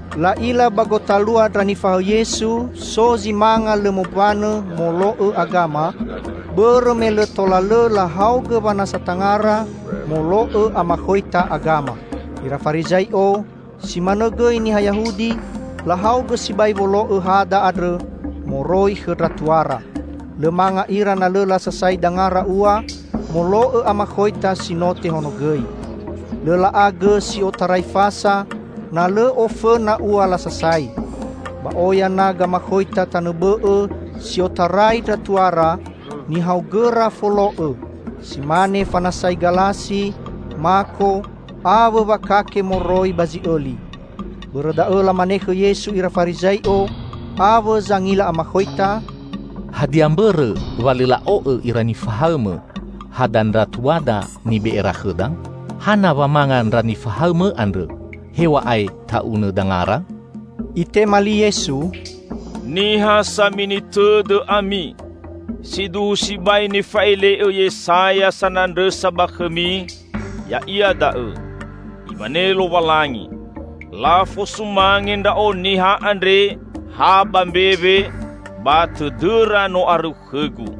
La'ila ba gotalua ndra nifahaõ Yesu so zi manga lõ mombanõ molo'õ agama, bõrõ me lõ tola lõ lahaogõ wanasa tangara molo'õ amakhoita agama. Ira Farizai'o, si manõ gõi niha Yahudi, lahaogõ sibai wolo'õ hada andrõ moroi khõ ndra tuara. Lõ manga ira na lõ lasasai dangara ua molo'õ amakhoita si no tehonogõi. Lõ la'a gõ si otarai fasa, na lõ ofõna ua lasasai. Ba oya na gamakhoita tanõ bõ'õ si otarai ndra tuara, nihaogõra folo'õ; si mane fanasai galasi, mako, awõ wakake moroi ba zi'õli. Bõrõ da'õ lamane khõ Yesu ira Farizai'o awõ zangila amakhoita, "Hadia mbõrõ wa lõ la'o'õ ira nifahaõ-Mõ hada ndra tuada nibe'era khõda? Hana wa manga ndra nifahaõ-Mõ andrõ hew̃a'ae ta'unõ dangara?" Itema li Yesu, "Niha samini tõdõ ami! Siduhu sibai nifa'ele'õ Yesaya sanandrõsa ba khõmi, ya'ia da'õ, 'Imane Lowalangi, lafosumange Ndra'o niha andre ha ba mbewe, ba tõdõra no arõu khõ-Gu.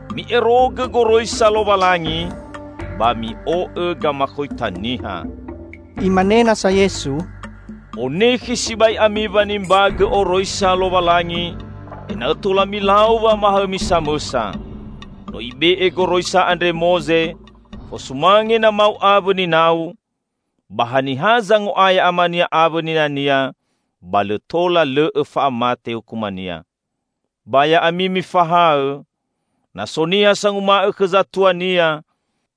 Mi'erogõ goroisa Lowalangi, ba mi'o'õ gamakhoita niha." Imane nasa Yesu, "Onekhe sibai ami wanimbagõ oroisa Lowalangi ena'õ tola milau wamahaõmi samõsa. No ibe'e goroisa andre Moze, 'Fosumange namau awõ ninau,' ba 'haniha zango'aya amania awõ ninania, ba lõ tola lõ'õ fa'amate hukumania.' Ba ya'ami mifahaõ: Na so niha sanguma'õ khõ zatuania,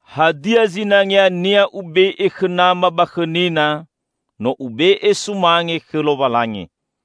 'Hadia zinangeania ube'e khõ nama ba khõ nina, no ube'e sumange khõ Lowalangi!'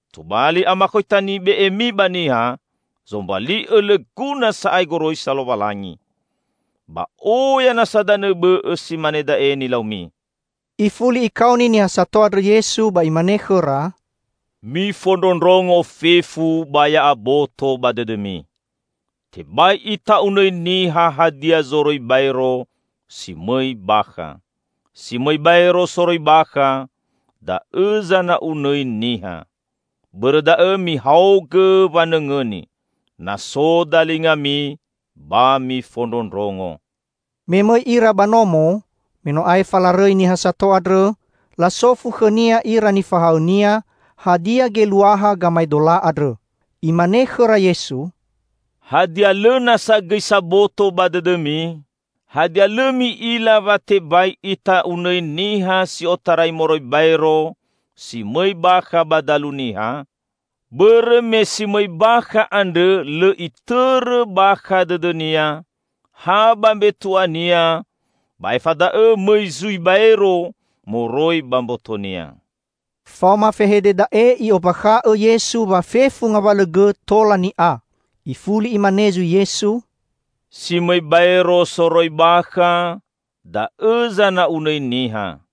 Tobali amakhoita nibe'emi ba niha zombali'õ lõ guna sa'ae goroisa Lowalangi. Ba oya nasa danõ bõ'õ si mane da'e nilaumi." Ifuli Ikaoni niha sato andrõ Yesu ba Imane khõra, "Mifondrondrongo fefu, ba ya'aboto ba dõdõmi! Tebai ita'unõi niha hadia zoroi baero si mõi bakha. Si mõi baero soroi bakha, da'õ zana'unõi niha. [Bõrõ da'õ mihaogõ wanõngõni, na so dalingami ba mifondrondrongo!]" Me mõi ira ba nomo, me no aefa larõi niha sato andrõ, lasofu khõ-Nia ira nifahaõ-Nia hadia geluaha gamaedola andrõ. Imane khõra Yesu, "Hadia lõ nasa gõi saboto ba dõdõmi? Hadia lõ mi'ila wa tebai ita'unõi niha si otarai moroi baero si mõi bakha ba dalu niha? Bõrõ me si mõi bakha andrõ lõ itõrõ bakha dõdõnia, ha ba mbetu'ania ba aefa da'õ mõi zui baero moroi ba mbotonia." Faoma fehede da'e I'ombakha'õ Yesu wa fefu ngawalõ gõ tola ni'a. Ifuli Imane zui Yesu, "Si mõi baero soroi bakha, da'õ zana'unõi niha.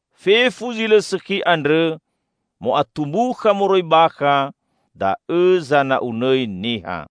Fefu zi lõ sõkhi andrõ mo'atumbukha moroi bakha, da'õ zana'unõi niha."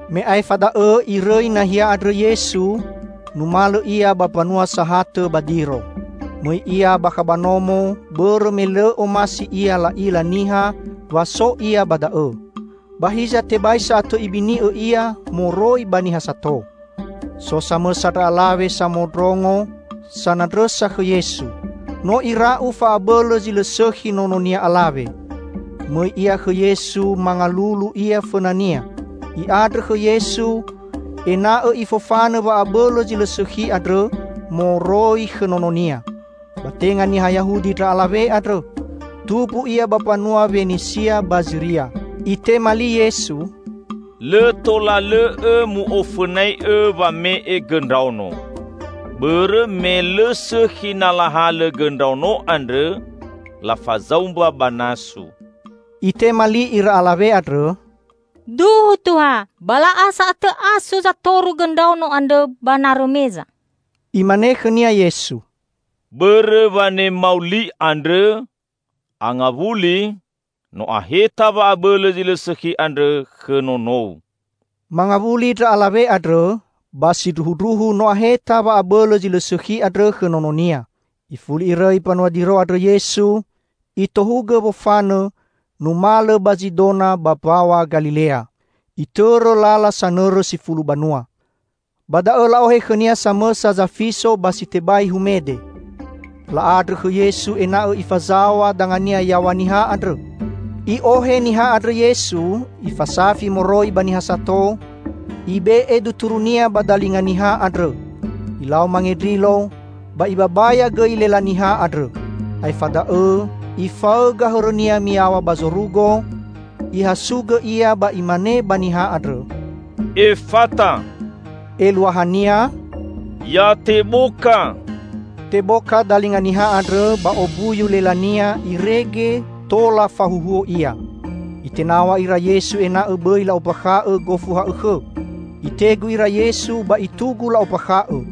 Me aefa da'õ Irõi nahia andrõ Yesu, numalõ Ia ba mbanua sahatõ ba Diro. Mõi Ia bakha ba nomo bõrõ me lõ omasi Ia la'ila niha wa so Ia ba da'õ. Ba hiza tebai sa'atõ Ibini'õ Ia moroi ba niha sato. So samõsa ndra alawe samondrongo sanandrõsa khõ Yesu. No ira'u fa'abõlõ zi lõ sõkhi nononia alawe. Mõi ia khõ Yesu mangalulu ia fõna-Nia, i'andrõ khõ Yesu ena'õ Ifofanõ wa'abõlõ zi lõ sõkhi andrõ moroi khõ nononia. Ba tenga niha Yahudi ndra alawe andrõ, tumbu ia ba mbanua Wenisia ba Ziria. Itema li Yesu, "Lõ tola lõ'õ mu'ofõnai'õ wame'e gõ ndraono. Bõrõ me lõ sõkhi na lahalõ gõ ndraono andrõ lafazaumba ba nasu." Itema li ira alawe andrõ, "Duhu, Tuha, ba la'a sa'atõ asu zatoru gõ ndraono andrõ ba narõ meza!" Imane khõnia Yesu, "Bõrõ wanemau li andrõ, angawuli; no aheta wa'abõlõ zi lõ sõkhi andrõ khõ nonou!" Mangawuli ndra alawe andrõ, ba sindruhundruhu no aheta wa'abõlõ zi lõ sõkhi andrõ khõ nononia. Ifuli Irõi mbanua Diro andrõ Yesu, Itohugõ wofanõ numalõ ba Zidona ba Mbaw̃a Galilea. Itõrõ lala sanõrõ Si Fulu Banua. Ba da'õ la'ohe khõ-Nia samõsa zafiso ba si tebai humede. La'andrõ khõ Yesu ena'õ Ifazaw̃a danga-Nia yaw̃a niha andrõ. I'ohe niha andrõ Yesu, Ifasafi moroi ba niha sato, Ibe'e duturu-Nia ba dalinga niha andrõ. Ilau mangendrilo, ba Ibabaya gõi lela niha andrõ. Aefa da'õ Ifaõga hõrõ-Nia miyaw̃a ba zorugo, Ihasugõ Ia ba Imane ba niha andrõ, "Efata," eluahania, "Ya teboka!" Teboka dalinga niha andrõ ba ombuyu lelania irege tola fahuhuo ia. Itenaw̃a ira Yesu ena'õ bõi la'ombakha'õ gofu ha'õkhõ. Itegu ira Yesu ba itugu la'ombakha'õ.